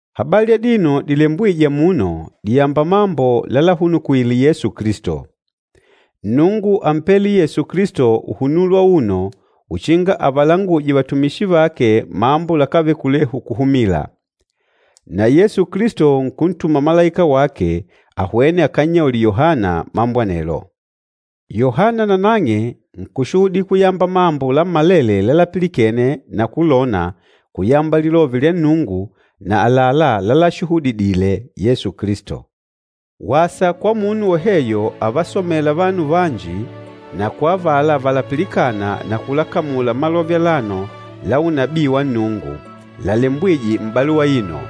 Habali adino dilembwîje amuno dìyamba mambo lálahunukwìlè Yesu Kilisto. Nnungu ámpele Yesu Kilisto uhunulo auno uchinga avalanguje vatumishi vake mambo lakávele kulehu kuhumila. Na Yesu Kilisto nkuntuma malaika wake ahwene akannyaulile Yohana mambo anelo. Yohana nanang'e nkùshuhudila kuyamba mambo lammalele lalapilikene na kulona kuyamba Lilove lya Nnungu na àlalá lálashuhudidìlè Yesu Kilisto. Wasa kwa munu woheyo avasomêla vanu vanji na kwa avala valapilikâna na kulakamula malove alano la unabii wa Nnungu, lalembwîje m'baluwa aino,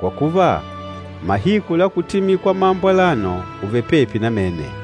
kwa kuva mahiku la kutimila kwa mambo alano, ùvele pepi namene.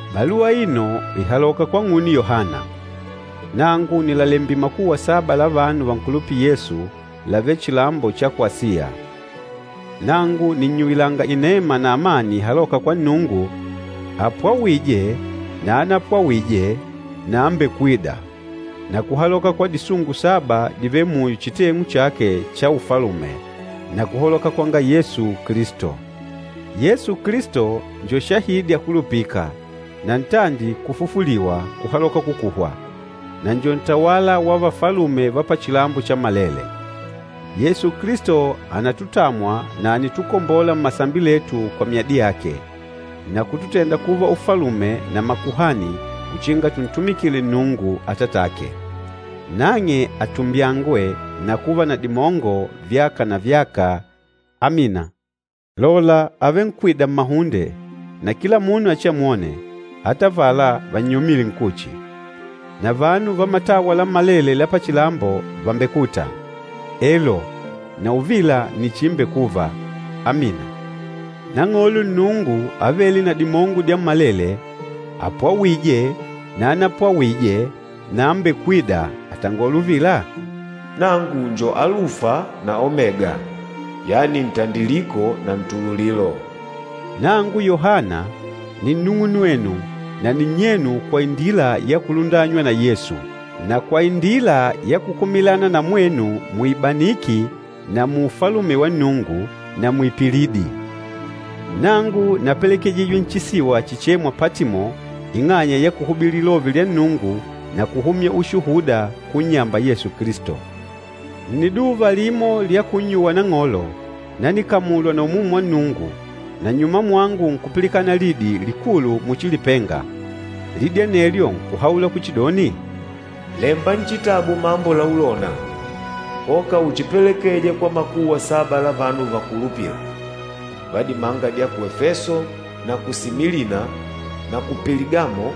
Baluwa aino ìhaloka kwang'une Yohana. Nangu nìlalembila makuwa saba la vanu vankulupîla Yesu lavêle chilambo cha ku Asiya. Nangu nìnnyuwilanga inema na amani ihalôka kwa Nnungu, apwawîje na anapwawîje na ambekwîda, na kuhaloka kwa disungu saba divêle muyo chiteng'u chake cha Ufalume, na kuhaloka kwanga Yesu Kilisto. Yesu Kilisto njo shahidi akulupîka, na ntandi kufufuliwa kuhaloka kukuhwa, na njo ntawala wa vafalume va pachilambo chammalele. Yesu Kilisto ànatutamwa na ànitukombola mmasambi letu kwa myadi yake, na kututenda kuva ufalume na makuhani uchinga tuntumikile Nnungu, Atatake. Nang'e atumbyangwe na kuva na dimongo vyaka na vyaka! Amina. Lola, àvenkwida mmahunde, na kila munu achiamwone, ata avala vannyomîle nkuchi. Na vanu va matawa lammalele la pachilambo vàmbekuta. Elo, na uvila nni chiimbekuva! Amina. Nang'olo Nnungu Avêle na Dimongo Dyammalele, apwawîje na anapwawîje na ambekwîda àtangola uvila, “Nangu njo Alufa na Omega, yani Ntandiliko na Ntululilo.” Nangu Yohana, ni nnung'unwenu na ninnyenu kwa indila ya kulundanywa na Yesu, na kwa indila ya kukumilana na mwenu muibaniki na muufalume wa Nnungu, na muipilidi. Nangu napelekejijwe nchisiwa chichêmwa Patimo ing'anya ya kuhubili Lilove lya Nnungu na kuhumya ushuhuda kunnyamba Yesu Kilisto. Nniduva limo lya kunnyuwa Nang'olo, nanikamulwa na Umumu wa Nnungu, na nnyuma mwangu nkupilikana lidi likulu muchi lipenga. Lidi anelyo nkuhaula kuchidoni, “Lemba nchitabu mambo laulona, koka uchipelekeje kwa makuwa saba la vanu vangukulupîla va dimanga dya ku Efeso, na ku Similina, na ku Peligamo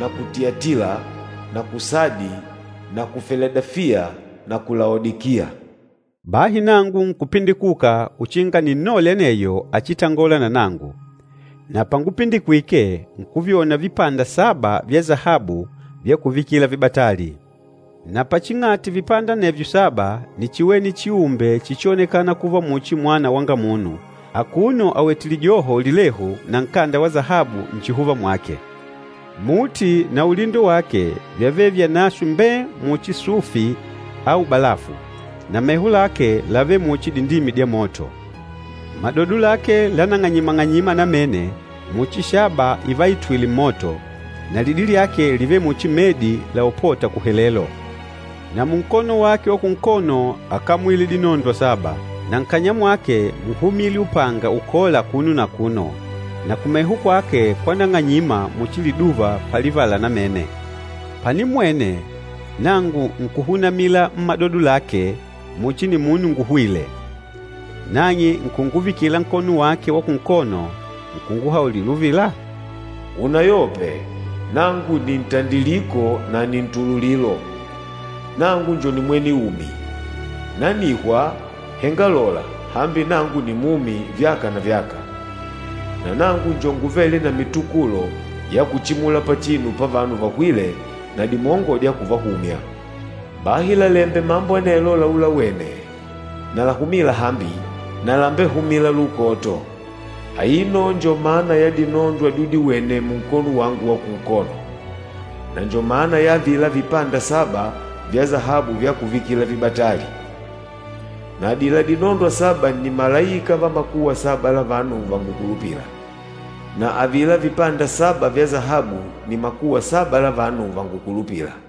na ku Tiyatila na ku Sadi na ku Filadefiya na ku Laodikiya.” Bahi nangu nkupindikuka uchinga ninnole aneyo áchitangòlà na nangu, na pángupindikwìkè nkuvyona vipanda saba vya sahabu vya kuvikila vibatali. Na paching'ati vipanda anevyo saba níchiwene chiumbe chíchionekànà kuva muchi Mwana wanga Munu, akuno awètè lijoho lilehu na nkanda wa sahabu nchihuva mwake. Muti na ulindo wake vyávele vyanaswe mbée muchi sufi au balafu, na meho lake lávele muchi dindimi dya moto. Madodo lake lánang'anyima-ng'anyima namene muchi shaba ivaitwîle mmoto, na lidi lyake lívele muchi medi laopôta kuhelelo. Na munkono wake wa kunkono ákamwile dinondwa saba, na nkanya mwake múhumile upanga ukola akuno na akuno, na kumeho kwake kwánang'anyima muchi liduva palivala namene. Panimmwene, nangu nkuhunamila mmadodo lake muchi nimunu nguhwîle. Nang'e nkunguvikila nkono wake wa kunkono, nkunguhaulila uvila, “Unayope! Nangu nni ntandiliko na nni ntululilo. Nangu njo nimwene umi! Nanihwa, henga lola, hambi nangu nimumi vyaka na vyaka. Na nangu njo nguvêle na mitukulo ya kuchimula pachinu pavanu vahwîle, na dimongo dya kuvahumya. Bahi lalembe mambo anelo laulawene na lahumîla hambi, na lambehumîla lukoto. Aino njo mana ya dinondwa dyudiwene munkono wangu wa kunkono, na njo mana ya avila vipanda saba vya sahabu vya kuvikila vibatali. Na adila dinondwa saba ni malaika va makuwa saba la vanu vangukulupîla, na avila vipanda saba vya sahabu ni makuwa saba la vanu vangukulupîla.”